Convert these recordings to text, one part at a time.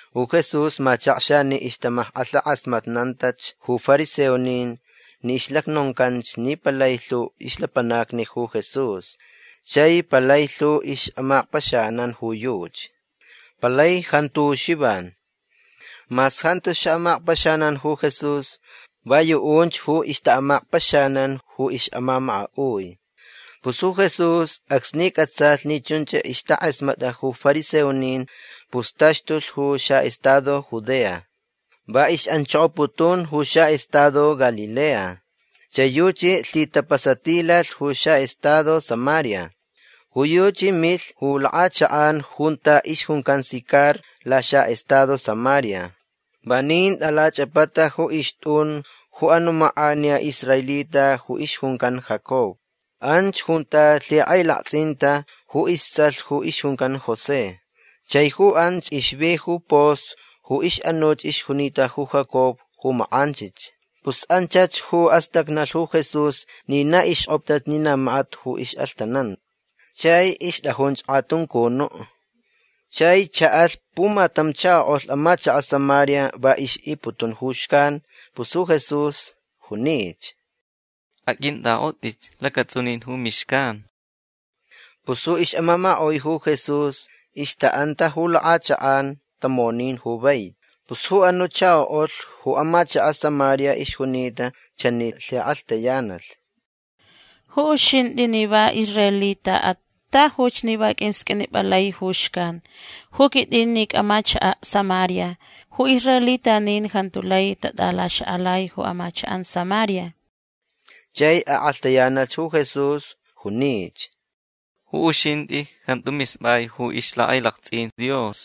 Ju Jesús machakxa ni ixtamackʼalhakʼasmatnantach ju fariseonin ni ixlacnoncanch ni palai lhu ixlapanacni ju Jesús chai palai lhu ixʼamakpaxanan ju yuchi. Palai jantu ju Xivan. Mas jantu xaʼamakpaxanan ju Jesús. Va yuʼunch ju ixtaʼamakpaxanan ju ixʼamamakaʼui. Pus ju Jesús acsni cʼatsalh ni chunch ixtakʼasmatʼa ju fariseonin pus taxtulh ju xaʼestado Judea. Va ixʼanchokoputun ju xaʼestado Galilea. Chai yuchi lhitapasatilalh ju xaʼestado Samaria. Ju yuchi milh ju lakʼachakʼan junta ixjuncan Sicar laxaʼestado Samaria. Vanin tʼalachʼapata ju ixtʼun ju anuʼ makʼaniya israelita ju ixjuncan Jacob. Anch junta lhikʼailaktsʼinta ju istsʼalh ju ixjuncan José. Chai ju anch ixvi ju pos ju ixʼanuch ixjunita ju Jacob ju makʼanchich. Pus anchach ju astacnalh ju Jesús ni na ixkʼoptach ni na makat ju ixʼalhtananta. Chai ixtʼajunch kʼatuncunuʼ. Chai chaʼalh pumatam chakoʼulh amachakaʼ Samaria. Va ixʼiputun ju xcan. Pus ju Jesús junich: ―Aqʼuintʼakʼotʼich lacatsʼunin ju mixcan. Pus ju ixʼamamakaʼui ju Jesús ixtaʼanta ju lakʼachakʼan tamonin ju vaiti. Pus ju anuʼ chakoʼulh ju amachakaʼ Samaria ixjunita chanich lhikʼalhtayanalh: ―Ju uxintʼi ni va israelitaʼat tajuch ni va qʼuisqʼuinipʼalai ju xcan. Ju quitʼin ni icʼamachakaʼ Samaria. Ju israelitanin jantu lai tatʼalaxakʼalai ju amachakʼan Samaria. Chai akʼalhtayanalh ju Jesús. Junich: ―Ju uxintʼi jantu mispʼai ju ixlhakʼailaktsʼin Dios.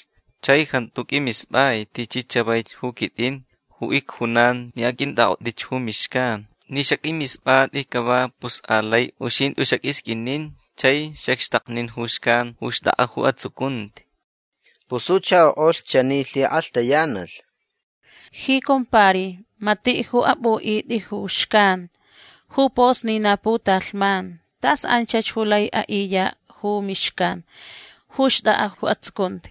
Chai jantu qʼuimispʼai tichi chavaich ju quitʼin ju icjunan ni aqʼuintʼakʼotʼich ju mixcan. Ni xaqʼuimispʼatʼi cava pus alai uxintʼi xaqʼuisqʼuinin chai xacxtaknin ju xcan ju xtʼakʼa ju atsucunti. Pus ju chakoʼulh chani lhikʼalhtayanalh: ―Ji compari matiʼ ju apʼuʼitʼi ju xcan. Ju pos ni na putalhman. Tas anchach ju lai aʼiyaʼ ju mixcan ju xtʼakʼa ju atsucunti.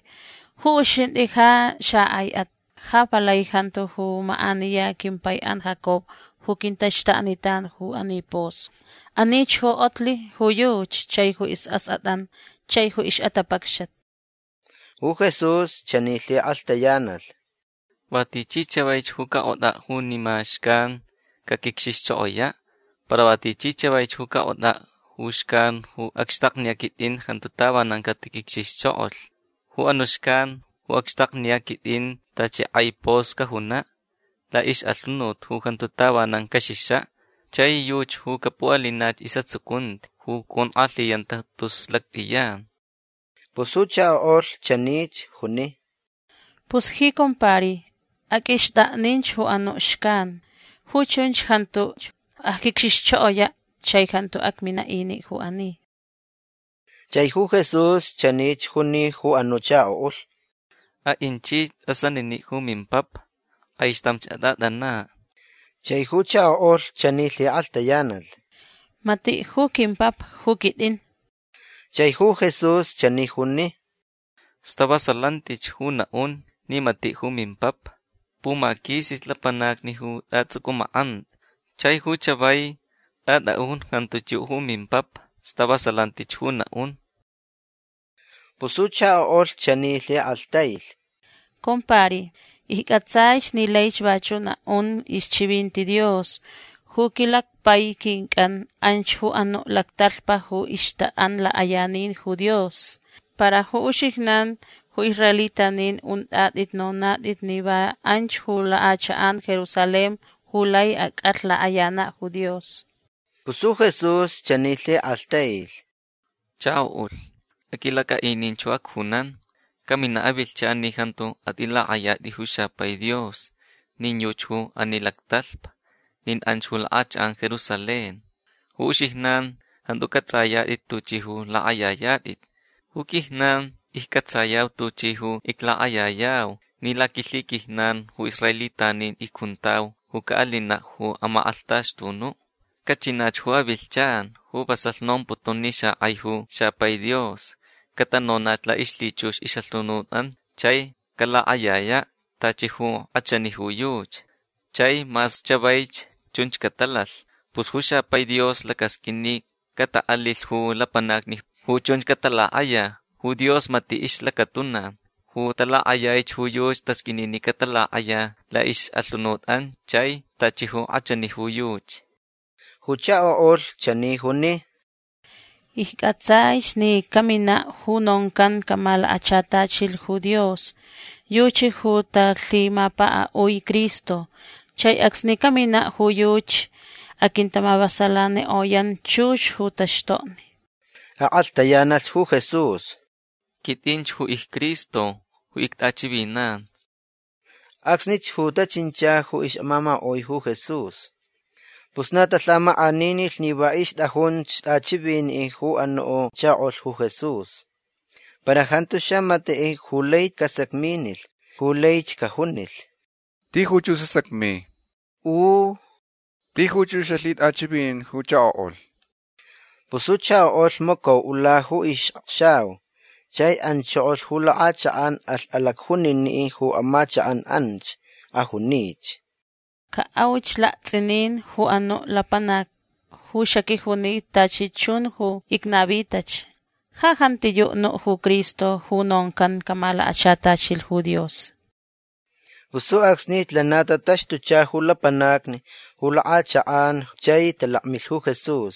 Ju uxintʼi ja xakʼaiʼat. Ja palai jantu ju makʼaniya quimpaiʼan Jacob ju quintaxtaknitan ju ani pos. Anich ju kʼotlh ju yuchi chai ju isʼaskʼatʼan chaich ju ixʼatapacxat. Ju Jesús chani lhikʼalhtayanalh: ―Va tichi chavaich ju cakʼotʼaʼ junima xcan caquicxixchokoyaʼ. Para va tichi chavaich ju cakʼotʼaʼ ju xcan ju acxtakniyaʼ quitʼin jantu tavanan catiquicxixchokolh. Ju anuʼ xcan ju acxtakniyaʼ quitʼin tachi kʼai pos cajunaʼ laʼixʼalhunut ju jantu tavanan caxixaʼ. Chai yuchi ju capuʼalinach isʼatsucunti ju conkʼalhiyanta tus lactʼiyan. Pus ju chakoʼulh chanich juni: ―Pus ji compari aqʼuixtʼakninch ju anuʼ xcan. Ju chunch jantuch acquicxixchokoyaʼ. Chai jantu acminaʼ iniʼ ju ani. Chai ju Jesús chanich juni ju anuʼ chakoʼulh: ―Aʼinchich tʼasaniniʼ ju mimpapa. Kʼaixtamch atʼatʼanaʼ. Chai ju chakoʼulh chani lhikʼalhtayanalh: ―Matiʼ ju quimpapa ju quitʼin. Chai ju Jesús chani juni: ―Stavasalantich ju naʼun ni matiʼ ju mimpapa. Pumaquisich lapanacni ju tʼatsʼucʼumakʼantʼa. Chai ju chavai tʼatʼaʼun jantuch yuʼ ju mimpapa. Stavasalantich ju naʼun. Pus ju chakoʼulh chani lhikʼalhtailh: ―Compari iccʼatsaich ni laich vachuʼ naʼun ixchivinti Dios. Ju quilacpai quincʼan anch ju anuʼ lactalhpa ju ixtaʼan lakʼayanin ju Dios. Para ju uxijnan ju israelitanin untʼatʼit nonatʼit ni va anch ju lakʼachakʼan Jerusalén ju lai acʼalh lakʼayanaʼ ju Dios. Pus ju Jesús chani lhikʼalhtailh: ―Chakoʼulh aqʼuilacʼaʼininch ju acjunan. Caminaʼ avilhchan ni jantu atʼilakʼayatʼit ju xapai Dios nin yuchi ju ani lactalhpa nin anch ju lakʼachakʼan Jerusalén. Ju uxijnan jantu cʼatsʼayatʼit tuchʼi ju lakʼayayatʼit. Ju quijnan iccʼatsayau tuchi ju iclakʼayayau ni laquilhiquijnan ju israelitanin icjuntau ju caʼalinaʼ ju amakʼalhtaxtunuʼ. Cachinach ju avilhchan ju vasalh nomputun ni xakʼai ju xapai Dios catanonach laʼixlhichux ixʼalhunutʼan chai calakʼayayaʼ tachi ju kʼachani ju yuchi. Chai mas chavaich chunch catalalh. Pus ju xapai Dios lacasqʼuin ni cataʼalilh ju lapanacni ju chunch catalakʼaya. Ju Dios matiʼ ixlacatuna. Ju talakʼayaich ju yuchi tasqʼuini ni catalakʼaya laʼixʼalhunutʼan chai tachi ju kʼachani ju yuchi. Ju chakoʼulh chani juni: ―Iccʼatsaich ni caminaʼ ju noncan camalakachatachilh ju Dios. Yuchi ju talhimapakaʼui Cristo. Chai acsni caminaʼ ju yuchi aquintamavasalanikʼoyan chux ju taxtokni. Akʼalhtayanalh ju Jesús: ―Quitʼinch ju icCristo ju ictʼachivinan. Acsnich ju tachincha ju ixʼamamakaʼui ju Jesús. Pus na talhamakʼaninilh ni va ixtʼajunch tʼachiviniʼ ju anuʼ chakoʼulh ju Jesús. Para jantu xamatiʼ ju lai casacminilh ju laich cajunilh: “Tijuch ju sasacmi” U “Tijuch ju xalhitʼachʼivinin ju chakoʼulh”. Pus ju chakoʼulh macauʼula ju ixʼakxau chai anchokolh ju lakʼachakʼan. Alh alacjuniniʼ ju amachakʼan anch. Ajunich: ―Caʼauch laktsʼinin ju anuʼ lapanac ju xaquijuni tachi chun ju icnavitach. Ja jantiyuʼ nuʼ ju Cristo ju noncan camalakachatachilh ju Dios. Pus ju acsnich lana tataxtucha ju lapanacni ju lakʼachakʼan chai talakmilh ju Jesús.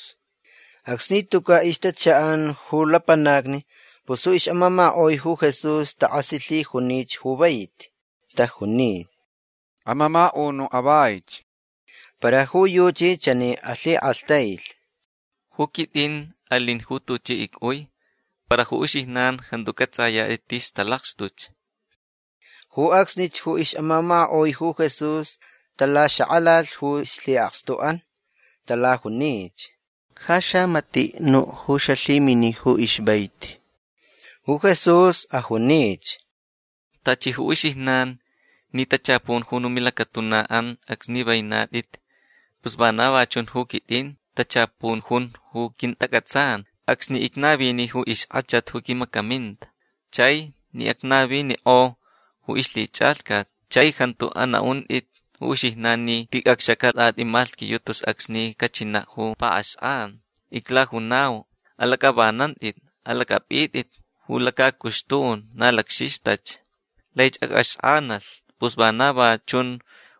Acsni tucaʼ ixtachaʼan ju lapanacni pus ju ixʼamamakaʼui ju Jesús takʼasilhijunich ju vaiti. Tajuni: ―Amamakaʼunuʼ avaich. Para ju yuchi chani alhikʼalhtailh: ―Ju quitʼin alin ju tuchi icʼui. Para ju uxijnan jantu cʼatsʼayatʼit tis talakxtuch. Ju acsnich ju ixʼamamakaʼui ju Jesús talaxakʼalalh ju ixlhiʼakstuʼan. Talajunich: ―Ja xamatiʼ nuʼ ju xalhimini ju ixvaiti. Ju Jesús ajunich: ―Tachi ju uxijnan ni tachapun jun ju milacatunaʼan acsni venatʼit pus vana va chun ju quitʼin. Tachapun jun ju quintacʼatsan acsni icnavini ju ixkʼachat ju quimacaminta chai ni acnavinikʼo ju ixlhichʼalhcat. Chai jantu anaʼuntʼit ju uxijnan ni ticʼacxacaʼ lakatʼatʼi malhquiyuʼ tus acsni cachinaʼ ju paʼaxkʼan. Iclajunau: Alacʼavanantʼit. Alacʼapʼitʼit ju lacacuxtun. Na lacxixtach. Laich acʼaxkʼanalh. Pus vana va chun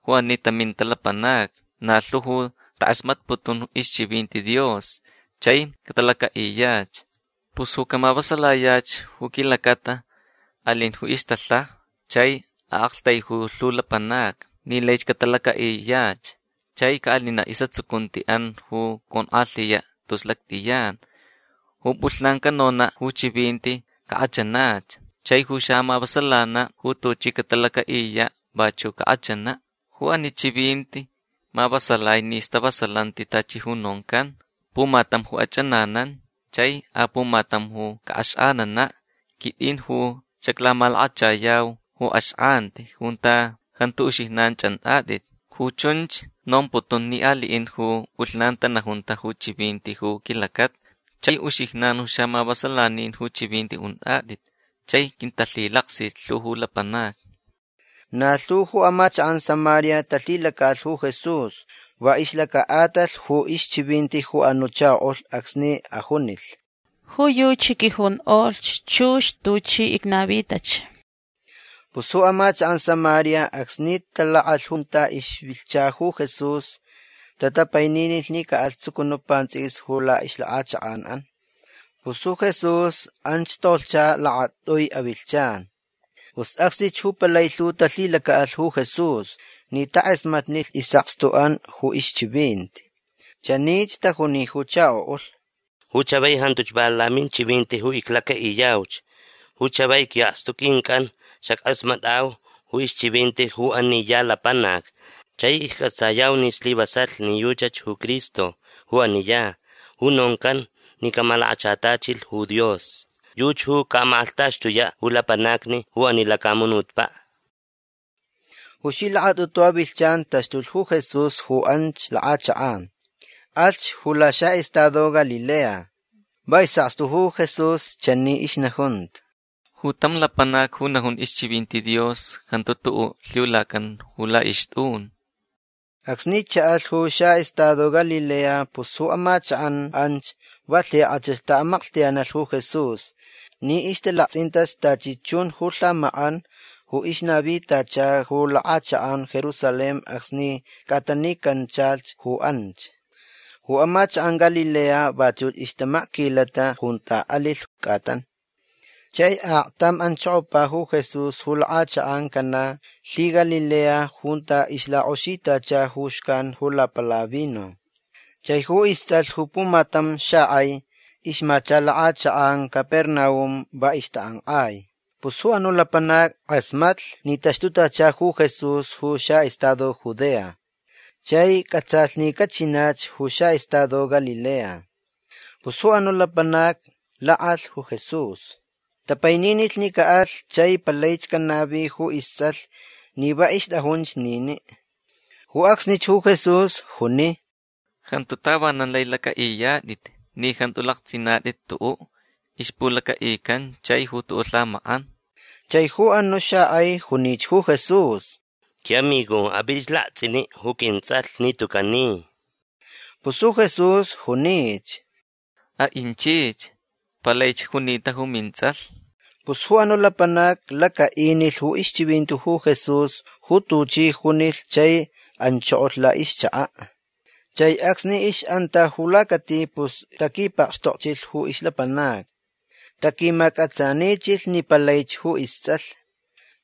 ju ani taminta lapanacni. Na lhu ju takʼasmatputun ixchivinti Dios chai catalacaʼiyach. Pus ju camavasalayach ju quilacata alin ju ixtalhaja chai aʼaktaijui lhu lapanacni ni laich catalacaʼiyach chai caʼalinaʼ isʼatsucuntiʼan ju conkʼalhiyaʼ tus lactʼiyan. Ju pʼulhnan canonaʼ ju chivinti cakʼachanach. Chai ju xamavasalanaʼ ju tuchi catalacaʼiyaʼ vachuʼ cakʼachanaʼ. Ju ani chivinti mavasalai ni stavasalanti tachi ju noncan: “Pumatam ju achʼananan. Chai apumatam ju caʼaxkʼananaʼ”. Quitʼin ju xaclamalakachayau ju axkʼanti junta jantu uxijnan chʼantʼatʼit. Ju chunch nomputun ni aliʼin ju pʼulhnan tanajunta ju chivinti ju quilacata chai uxijnan ju xaʼamavasalanin ju chivinti untʼatʼit chai quintalhilaksilh lhu ju lapanacni. Na lhu ju amachakʼan Samaria talhilacaʼalh ju Jesús va ixlacaʼatalh ju ixchivinti ju anuʼ chakoʼulh acsni ajunilh: “Ju yuchi quijonkʼoch chux tuchi icnavitach”. Pus ju amachakʼan Samaria acsni talakʼalh junta ixvilhcha ju Jesús tatapaininilh ni caʼalh tsucunuʼ pantsʼiquis ju laʼixlakʼachakʼanʼan. Pus ju Jesús anch tolhcha lakatʼui avilhchan. Pus acsnich ju palai lhu talhilacaʼalh ju Jesús ni takʼasmatnilh isʼakstuʼan ju ixchivinti. Chanich tajuni ju chakoʼulh: ―Ju chavai jantuch va laminchivinti ju iclacaʼiyauch. Ju chavai quiʼakstu quincʼan xackʼasmatʼau ju ixchivinti ju ani ya lapanac chai iccʼatsayau ni slivasalh ni yuchach ju Cristo ju ani ya ju noncan ni camalakachatachilh ju Dios. Yuchi ju caʼamakʼalhtaxtuyaʼ ju lapanacni ju ani lacamunutpaʼ. Ju ixlhilakatʼutu avilhchan taxtulh ju Jesús ju anch lakʼachakʼan. Alhch ju laxaʼestado Galilea. Va isʼakstu ju Jesús chani ixnajunta: ―Ju tam lapanac ju najun ixchivinti Dios jantu tuʼuʼ lhiulacan ju laʼixtʼun. Acsni chaʼalh ju xaʼestado Galilea pus ju amachakʼan anch va lhikʼachach taʼamaklhtayanalh ju Jesús ni ixtalaktsʼintach tachi chun ju lhamakʼan ju ixnavitacha ju lakʼachakʼan Jerusalén acsni cʼatanicanchalh ju anch. Ju amachakʼan Galilea vachuch ixtamakquilata junta alilh cʼatan. Chai aktam anchokopa ju Jesús ju lakʼachakʼan Caná lhiGalilea junta ixlakʼoxitacha ju xcan ju lapala vino. Chai ju istsʼalh ju pumatam xakʼai ixmacha lakʼachakʼan Capernaum. Va ixtakʼankʼai. Pus ju anuʼ lapanac kʼasmatlh ni taxtutachalh ju Jesús ju xaʼestado Judea. Chai cʼatsalh ni cachinach ju xaʼestado Galilea. Pus ju anuʼ lapanac lakʼalh ju Jesús. Tapaininilh ni caʼalh chai palaich canavi ju istsʼalh ni va ixtʼajunch niniʼ. Ju acsnich ju Jesús juni: ―Jantu tavanan lai lacʼaʼiyatʼit ni jantu laktsʼinatʼit tuʼuʼ ixpulacaʼican chai ju tuʼuʼ lhamakʼan. Chai ju anuʼ xakʼai junich ju Jesús: ―Quiʼamigo apʼitʼich laktsʼiniʼ ju quintsʼalh ni tucaʼ ni. Pus ju Jesús junich: ―Aʼinchich. Palaich junita ju mintsʼalh. Pus ju anuʼ lapanac lacaʼinilh ju ixchivinti ju Jesús ju tuchi junilh chai anchokolh laʼixchakaʼ. Chai acsni ixʼanta ju lacati pus taquipakxtokchilh ju ixlapanacni. Taquimacʼatsanichilhch ni palaich ju istsʼalh.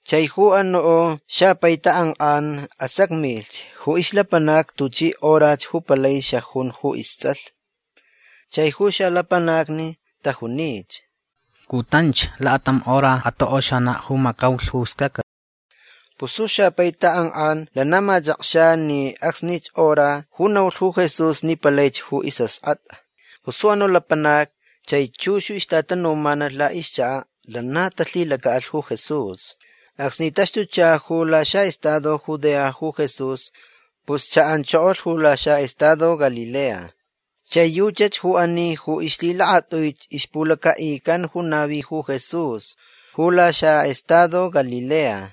Chai ju anuʼ xapai takʼankʼan asacmich ju ixlapanacni tuchi horach ju palai xajun ju istsʼalh. Chai ju xalapanacni tajunich: ―Cutanch. Lakatam hora atokʼoxanaʼ ju macaulh ju scacat. Pus ju xapai takʼankʼan lana machakxa ni acsnich hora ju naulh ju Jesús ni palaich ju isʼaskʼatʼa. Pus ju anuʼ lapanac chai chux ju ixtatanumanalh laʼixchakaʼ lana talhilacaʼalh ju Jesús. Acsni taxtucha ju laxaʼestado Judea ju Jesús pus chaʼanchokolh ju laxaʼestado Galilea. Chai yuchach ju ani ju ixlhilakatʼuich ixpulacaʼican ju navi ju Jesús ju laxaʼestado Galilea.